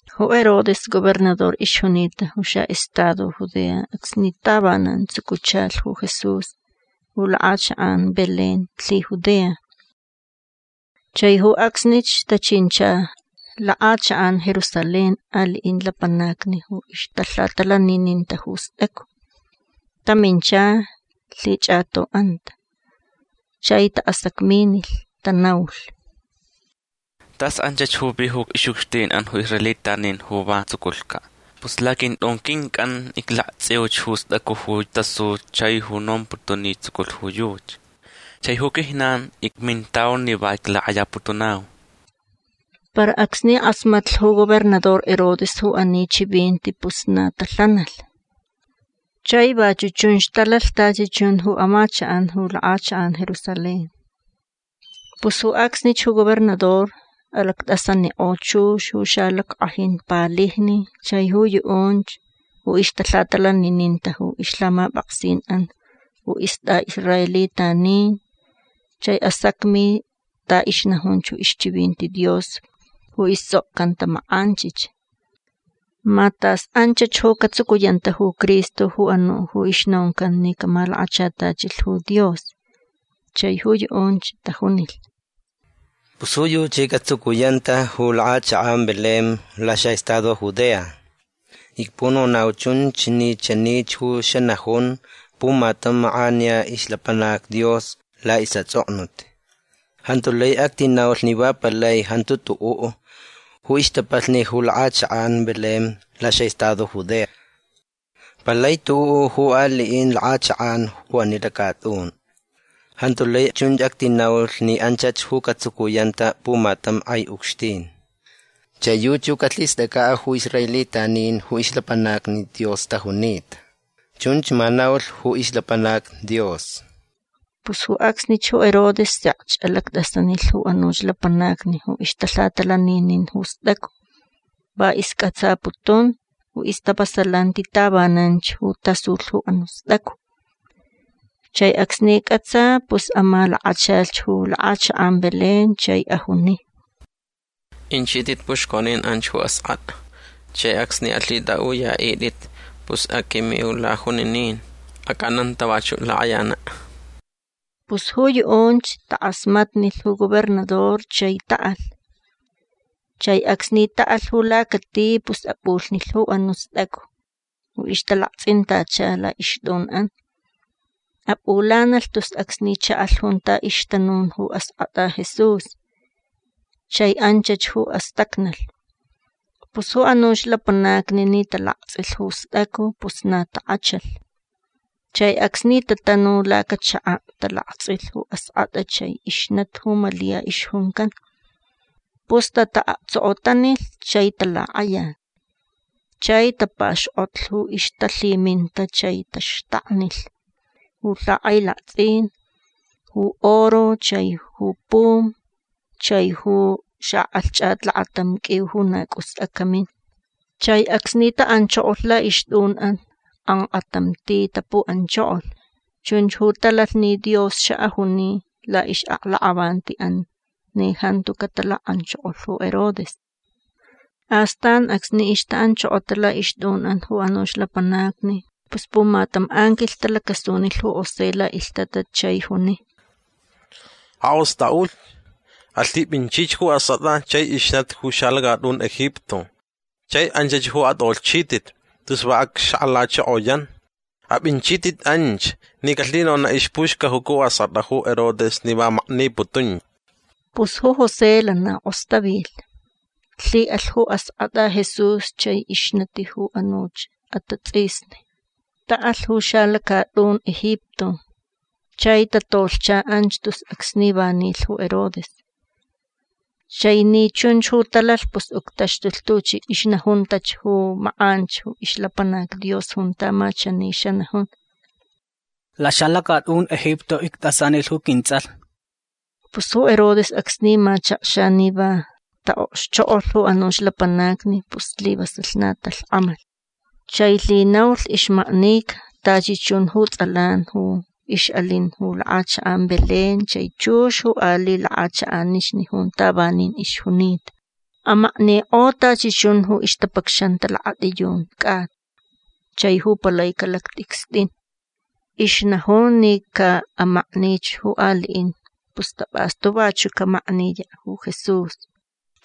Ju Herodes gobernador ixjunita ju xaʼestado Judea acsni tavanan tsucuchalh ju Jesús ju lakʼachakʼan Belén lhiJudea. Chai ju acsnich tachincha lakʼachakʼan Jerusalén aliʼin lapanacni ju ixtalhatalanininta ju stʼacu. Tamincha lhichʼatoʼanta. Chai taʼasacminilh. Tanaulh: ―Tas anchach ju vi ju ixʼucxtinʼan ju israelitanin ju va tsuculhcaʼ. Pus laquintʼun quincʼan iclaktsʼiuch ju stʼacu ju tasu chai ju nomputun ni tsuculh ju yuchi. Chai ju quijnan icmintau ni va iclakʼayaputunau. Para acsni kʼasmatlh ju gobernador Herodes ju ani chivinti pus na talhanalh. Chai vachuʼ chunch talalh tachi chun ju amachakʼan ju lakʼachakʼan Jerusalén. Pus ju acsnich ju gobernador alactʼasanikʼo chux ju xalackʼajin palijni chai ju yuʼunch ju ixtalhatalanininta ju ixlhamapʼaksinʼan ju istʼaʼisraelitanin chai asacmi ta ixnajunch ju ixchivinti Dios ju istsʼokcanta makʼanchich. Ma tas anchach ju catsucuyanta ju Cristo ju anuʼ ju ixnoncan ni camalakachatachilh ju Dios. Chai ju yuʼunch tajunilh: ―Pus ju yuchi catsucuyanta ju lakʼachakʼan Belén laxaʼestado Judea. Icpunonau chunch ni chanich ju xanajun pumatam makʼaniya ixlapanac Dios laʼisʼatsʼoknut: Jantu lai actinaulh ni va palai jantu tuʼuʼ ju ixtapalhni ju lakʼachakʼan Belén laxaʼestado Judea. Palai tuʼuʼ ju aliʼin lakʼachakʼan ju ani lacatʼun. Jantu lai chun actinaulh ni anchach ju catsucuyanta pumatam kʼai ucxtin. Chai yuchi ju calhistʼacʼaʼ ju israelitanin ju ixlapanacni Dios tajunita. Chunch ma naulh ju ixlapanac Dios. Pus ju acsnich ju Herodes sekch alactʼasanilh ju anuch lapanacni ju ixtalhatalaninin ju stʼacu. Va iscʼatsaputun ju ixtavasalanti tavananch ju tasulh ju anuʼ stʼacu. Chai acsni cʼatsa pus amalakachalh ju lakʼachakʼan Belén chai ajuni: ―Inchitʼit puxconin anch ju askʼatʼa. Chai acsni alhitʼaʼuyaʼitʼit pus aquiminau lajuninin. Acʼananta vachuʼ lakʼayanaʼ. Pus ju yuʼunch takʼasmatnilh ju gobernador chai taʼalh. Chai acsni taʼalh ju lacati pus apʼulhnilh ju anuʼ stʼacu ju ixtalaktsʼintacha laʼixtʼunʼan. Apʼulanalh tus acsni chaʼalh junta ixtanun ju askʼatʼa Jesús. Chai anchach ju astacnalh. Pus ju anuch lapanacni ni talaktsʼilh ju stʼacu pus na takʼachalh. Chai acsni tatanu lacachakaʼ talaktsʼilh ju askʼatʼa chai ixnati ju Malia ixjuncan. Pus tataʼaktsokotanilh chai talakʼayalh. Chai tapaxkʼotlh ju ixtalhiminta chai taxtaknilh ju lhakʼailaktsʼin ju oro chai ju pum chai ju xakʼalhchʼat lakatam qʼuiu ju na cʼus acamin. Chai acsni taʼanchokolh laʼixtʼunʼan kʼankʼatam ti tapuʼanchokolh. Chunch ju talalh ni Dios xaʼajuni laʼixʼaklakʼavantiʼan ni jantu catalakʼanchokolh ju Herodes. Astan acsni ixtaʼanchokota laʼixtʼunʼan ju anuch lapanacni pus pumatam anquilh talacasunilh ju José laʼilhtatat chai juni: ―Akʼostʼaʼulh. Alhipʼinchich ju askʼatʼa chai ixnati ju xalacatʼun Egipto. Chai anchach ju atʼolhchitʼit tus va acxakʼalachokoyan. Apʼinchitʼit anch ni calhinonaʼ ixpuxcajuca ju askʼatʼa ju Herodes ni va makniputunch. Pus ju José lana kʼostavilh. Lhiʼalh ju askʼatʼa Jesús chai ixnati ju anuch atatsʼisni. Taʼalh ju xalacatʼun Egipto. Chai tatolhcha anch tus acsni va nilh ju Herodes. Chai ni chunch ju talalh pus uctaxtulh tuchi ixnajuntach ju makʼanch ju ixlapanac Dios junta ma chani xanajun: “Laxalacatʼun Egipto ictʼasanilh ju quintsʼalh”. Pus ju Herodes acsni machakxa ni va taʼokxchokʼolh ju anuch lapanacni pus slivasalh na talhkʼamalh. Chai lhinaulh ixmaknica tachi chun ju tsʼalan ju ixʼalin ju lakʼachakʼan Belén chai chux ju aliʼ lakʼachakʼanixni junta vanin ixjunita. Amaknikʼo tachi chun ju ixtapacxanta lakatʼiyun cʼata chai ju palaicaʼ lactʼicstʼin. Ixnajun ni caʼamaknich ju aliʼin pus tapʼastu vachuʼ camakniyaʼ ju Jesús.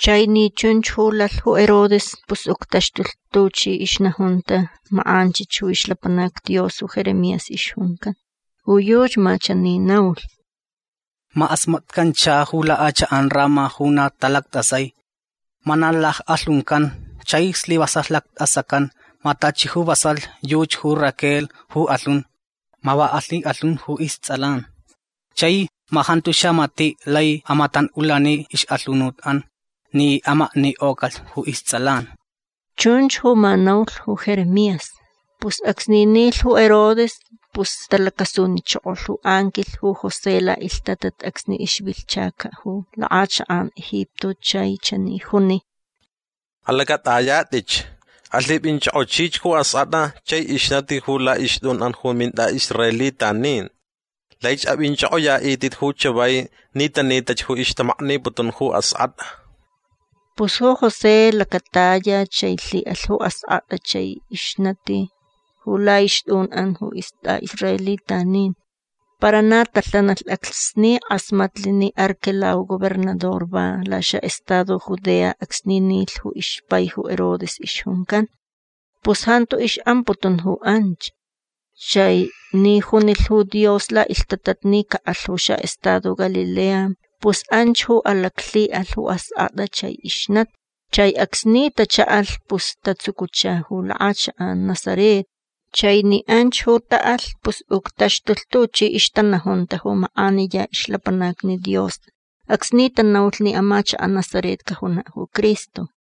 Chai ni chunch ju lalh ju Herodes pus uctaxtulh tuchi ixnajunta makʼanchich ju ixlapanac Dios ju Jeremías ixjuncan. Ju yuchi ma chani naulh: Ma kʼasmatcancha ju lakʼachakʼan Ramá ju na talactʼasai. Ma na lackʼalhuncan chai slivasalh lactʼasacan. Ma tachi ju vasalh yuchi ju Raquel ju kʼalhun. Ma va alhikʼalhun ju istsʼalan. Chai ma jantu xamatiʼ lai amatanʼulani ixʼalhunutʼan ni amaknikʼocalh ju istsʼalan. Chunch ju ma naulh ju Jeremías. Pus acsni nilh ju Herodes pus talacasunichokolh ju anquilh ju José laʼilhtatat acsni ixvilhchacaʼ ju lakʼachakʼan Egipto chai chani juni: ―Alacʼatʼayatʼich. Alhipʼinchʼokʼochich ju askʼatʼa chai ixnati ju laʼixtʼunʼan ju mintʼaʼisraelitanin. Laich apʼinchʼokʼoyaʼitʼit ju chavai ni tanitach ju ixtamakniputun ju askʼatʼa. Pus ju José lacataya chai lhiʼalh ju askʼatʼa chai ixnati ju laʼixtʼunʼan ju istʼaʼisraelitanin. Para na talhanalh acsni kʼasmatlh ni Arquelao gobernador va laxaʼestado Judea acsni nilh ju ixpai ju Herodes ixjuncan. Pus jantu ixʼamputun ju anch. Chai ni junilh ju Dios laʼilhtatat ni caʼalh ju xaʼestado Galilea pus anch ju alaclhiʼalh ju askʼatʼa chai ixnati. Chai acsni tachaʼalh pus tatsucucha ju lakʼachakʼan Nazaret. Chai ni anch ju taʼalh pus uctaxtulh tuchi ixtanajunta ju makʼaniya ixlapanacni Dios acsni tanaulh ni amachakaʼ Nazaret cajunaʼ ju Cristo.